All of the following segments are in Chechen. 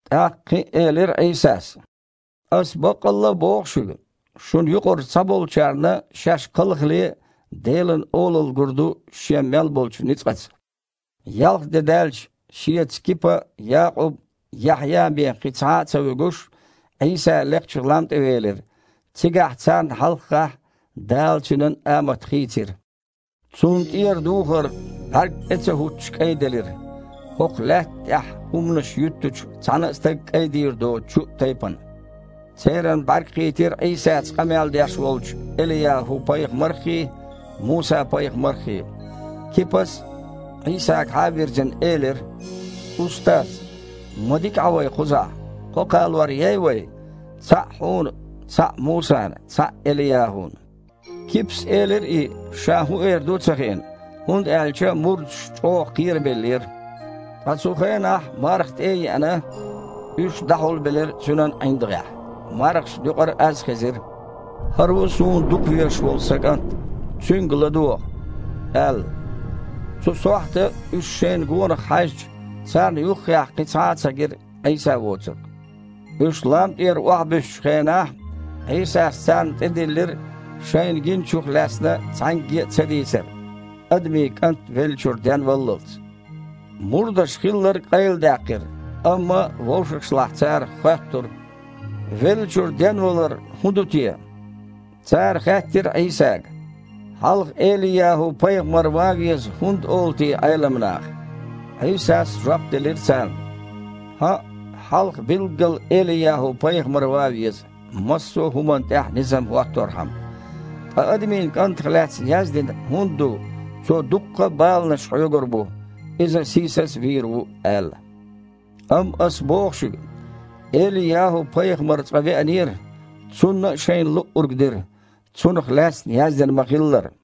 ТІаккха кхин а элира Іийсас: «Аса баккъалла а боху шуьга: шуна юкъарчу цхьаболчарна, шаьш кхалхале Делан Олалла гур ду шен мел болчу ницкъаца». Ялх де даьлча, Шеца Кипа, Якъуб, Яхьъя бен кхин цхьа а ца вуьгуш, Іийса лекхачу лам тІе велира. Цигахь, царна хьалххахь, Дала Цуьнан амат хийцира. Цунна тІера духар бІаьрг тІе а ца хІуттуш кІайделира, хІокху лаьтта тІехь хІуманаш юьттучу цхьана а стага кІайдийр доцучу тайпана. Церан бІаьрг кхийтира Іийсаца къамел деш волчу ЭлияхІу-пайхамарххий, Муса-пайхамарххий. Кипас, Іийсагахьа а вирзина, элира: «Устаз! Ма дика Іа вай кхузахь, кхо кхалор ей вай: цхьаъ Хьуна, цхьаъ Мусана, цхьаъ ЭлияхІуна». Кипас элира и, ша хІун эр ду а ца хиъна, хІунда аьлча мурдаш чІогІа кхерабеллера. Ткъа цу хенахь, марха тІе а еана, уьш дІахьулбелира цуьнан ІиндагІехь, мархашна юкъара аз хезира: «ХІара ву Суна дукхавезаш волу Сан КІант. Цуьнга ладогІа!» – аьлла. Цу сохьта, уьш шайна гонах хьаьжча, царна юххехь кхин цхьа а ца гира, Іийса воцург. Уьш лам тІера охьабуьссучу хенахь, Іийсас царна тІедиллира, шайна гиначух лаьцна цхьаьнгге а ца дийцар, Адамийн КІант веллачуьра денваллалц. Мурдаша хилларг къайладаьккхира, амма вовшашлахь цара хоьттура: «Веллачуьра денвалар хІун ду те?» Цара хаьттира Іийсага: «Хьалха ЭлияхІу-пайхамар ван веза хІунда олу те Іелам наха?» Іийсас жоп делира царна: «ХІаъ, хьалха билггала ЭлияхІу-пайхамар ван веза, массо а хІуманна тІехь низам хІотторхьама. Ткъа Адамийн КІантах лаьцна яздина хІунда ду, Цо дуккха а баланаш хьоьгур бу, Иза сийсаз а вийр ву аьлла? Амма Ас боху шуьга, ЭлияхІу-пайхамар цкъа веанера, цунна а шайна луъург дира, цунах лаьцна яздина ма-хиллара».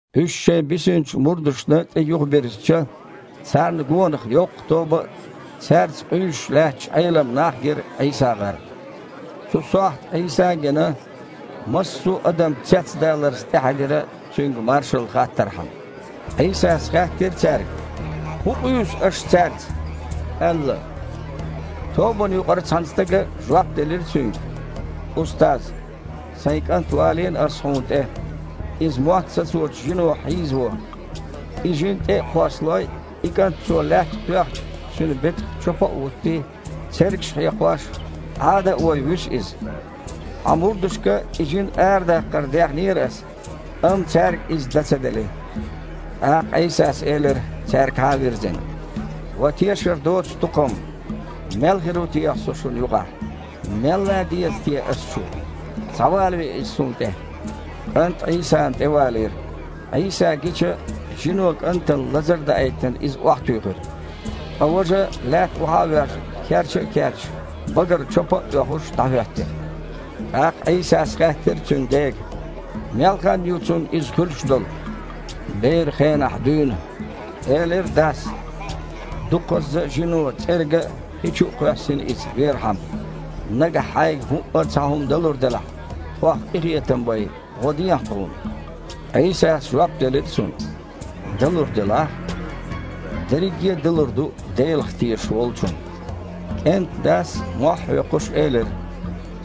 Уьш шайн бисинчу мурдашна тІе юхабирзича, царна гонах йоккха тоба а, цаьрца къуьйсуш лаьтташ Іелам нах а гира ІийсагІарна. Цу сохьта, Іийса а гина, массо а адам цецдаларца тІехьаьдира, Цуьнга маршалла хаттархьама. Іийсас хаьттира цаьрга: «ХІун къуьйсу аш цаьрца?» – аьлла. Тобанна юкъара цхьана стага жоп делира Цуьнга: «Устаз! Сайн кІант валийна аса Хьуна тІе. Иза мотт сацочу жино хьийзаво. И жин тІе а кхоссалой, и кІант цо лаьттах тоьхча, цуьнан бетах чопа а хІуттий, цергаш а хьекхош, Іада а вой, вуьсу иза. Хьан мурдашка и жин арадаккхар дехнера аса, амма цаьрга иза дан ца дели». ТІаккха Іийсас элира, цаьргахьа а вирзина: «Ва тешар доцу тукхам! Мел хир ву техьа Со шуна юкъахь? Мел лан деза техьа Аса шу? Схьавалаве иза Суна тІе». КІант Іийсана тІе валийра. Іийса гича, жино кІантана лазар а даийтина, иза охьатуьйхира. Ткъа важа, лаьтта охьа а воьжна, керча а керчаш, багара чопа а оьхуш дІахІоьттира. ТІаккха Іийсас хаьттира цуьнан дега: «Мел хан ю цунна иза хуьлуш долу?» «Беран хенахь дуьйна», – элира дас. «Дукхазза а жино цІерга а, хи чу а кхоьссина иза, верхьама. Нагахь Хьайга хІуъа а цхьа хІума далур делахь, тхох къинхетам бай, гІо дехьа тхуна». Іийсас жоп делира цунна: «Дан лур делахь?! – Дерриге а далур ду Делах тешаш волчунна». КІентан дас, велха а воьлхуш, элира: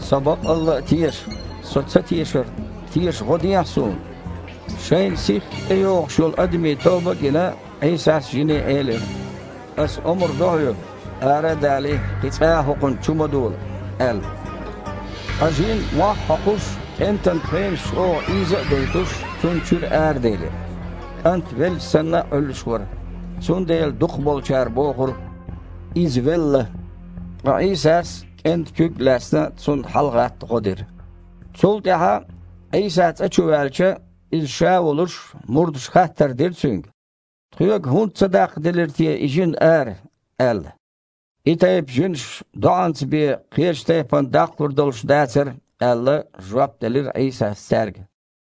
«Со баккъалла а теша! Со цатешарна, теша гІо дехьа суна!» Шайна сихха тІейогІуш йолу адамийн тоба а гина, Іийсас жине элира: «Аса омра до хьоьга: ара а далий, кхин цкъа а хІокхунна чу ма дола!» – аьлла. Ткъа жин, мохь а хьокхуш, кІентан пхенаш чІогІа ийза а дойтуш, цунна чуьра араделира. КІант, велча санна, Іуьллуш вара, цундела дукхахболчара бохура: «Иза велла». Ткъа Іийсас, кІентан куьг а лаьцна, цунна хьалагІатта гІо дира. Цул тІаьхьа, Іийса цІа чу ваьлча, Иза Ша волуш, мурдаша хаттар дира Цуьнга: «Тхоьга хІунда ца даккхаделира те и жин ара?» – аьлла. «И тайпа жинаш доІанца бен, кхечу тайпана даккхалур долуш дацара», – аьлла, жоп делира Іийсас цаьрга.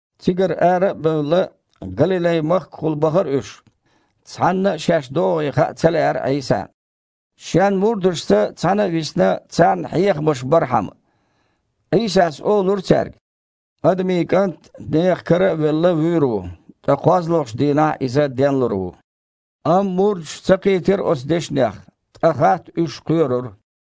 Цигара ара а бевлла, Галилай-махкахула бахара уьш. Цхьанна а шаьш догІий хаа ца лаьара Іийсана, Шен мурдашца цхьаьна а висина, царна хьехамаш бархьама. Іийсас олура цаьрга: «Адамийн КІант, нехан кара а велла, вуьйр ву, ткъа кхозлагІчу дийнахь Иза денлур ву». Амма мурдаш ца кхийтира оцу дешнех, ткъа хатта уьш кхоьрура.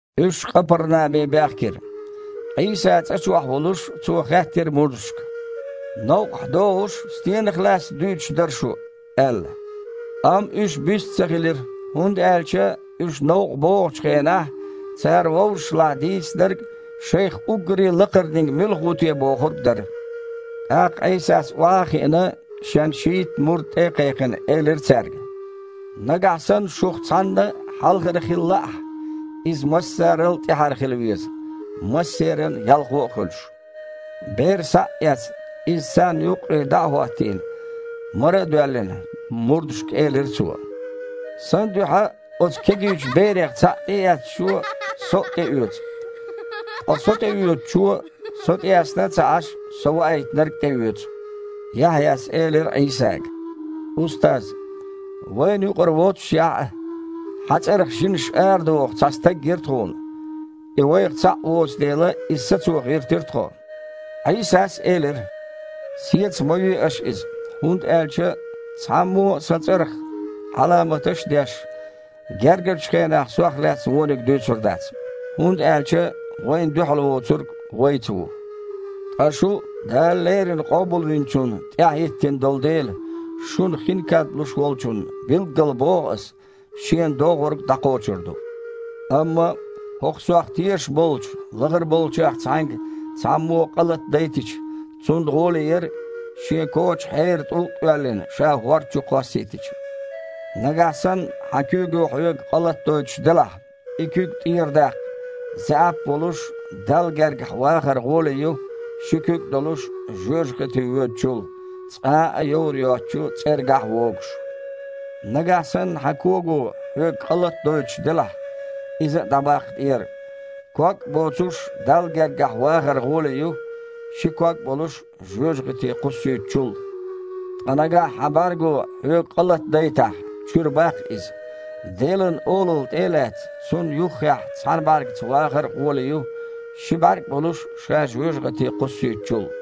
Уьш Къапарнаме баьхкира. Іийса цІа чохь волуш Цо хаьттира мурдашка: «Новкъахь догІуш стенах лаьцна дуьйцуш дара шу?» – аьлла. Амма уьш бист а ца хилира, хІунда аьлча уьш новкъа богІучу хенахь цара вовшашлахь дийцинарг шайх уггаре лакхарниг муьлха ву те бохург дара. ТІаккха Іийсас, охьа а хиъна, Шен шийтта мурд тІе а кхайкхина, элира цаьрга: «Нагахь санна шух цхьанна хьалхара хила лаахь, иза массарал а тІаьхьара хила веза, массеран а ялхо а хуьлуш». Бер схьа а эцна, иза царна юккъе дІа а хІоттийна, мара а доьллина, мурдашка элира Цо: «Сан дуьхьа оцу кегийчу берех цхьаъ тІеэцначо Со а тІеоьцу. Ткъа Со тІеоьцучо, Со тІеэцна а ца Іаш, Со Ваийтинарг а тІеоьцу». Яхьъяс элира Іийсага: «Устаз! Вайна юкъара воццушехь а, Хьан цІарах жинаш арадоху цхьа стаг гира тхуна. И вайх цхьаъ воцу дела, иза сацо гІиртира тхо». Іийсас элира: «Сеца ма ве аш иза, хІунда аьлча, цхьаммо а Сан цІарах Іаламаташ а деш, гергарчу хенахь Сох лаьцна вониг дуьйцур дац, хІунда аьлча вайна дуьхьал воцург вайца ву. Ткъа шу Дала леррина Къобалвинчунна тІаьхьа хІиттина долу дела, шуна хин кад луш волчунна, билггала боху Аса, шена догІург дІакхочур ду». «Амма, хІокху Сох тешаш болчу лахара болчех цхьаьнга цхьаммо къа латадайтича, цунна гІоле яра, шен коча хьеран тІулг а оьллина, ша хІорда чу кхоссийтича. Нагахь санна хьан куьйго хьоьга къа латадойтуш делахь, и куьг тІера даккха – заьІап а волуш, Далла гергахь вахар гІоле ю, ши куьг а долуш, жоьжахате воьдучул, цкъа а йовр йоцучу цІергахь а вогуш. Нагахь санна хьан кого хьоьга къа латадойтуш делахь, иза а дІабаккха тІера. Ког а боцуш Далла гергахь вахар гІоле ю, ши ког а болуш жоьжахате кхуссуьйтучул. Ткъа нагахь хьан бІаьрго хьоьга къа латадайтахь, чуьра баккха иза. Делан Олалла тІе а лаьцна, Цунна юххехь цхьана бІаьргаца вахар а гІоле ю, ши бІаьрг а болуш ша жоьжахате кхуссуьйтучул,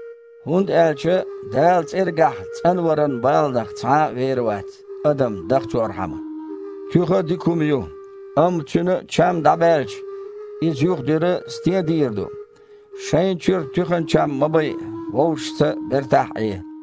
ХІунда аьлча Дала цІергахь цІанваран баланах цхьа а вер вац, адам дахчорхьама. Туьха дика хІума ю, амма цуьнан чам дІабаьлча, иза юха дуьра стен дийр ду? Шайна чуьра туьхан чам ма байа, вовшашца бертахь а Іе».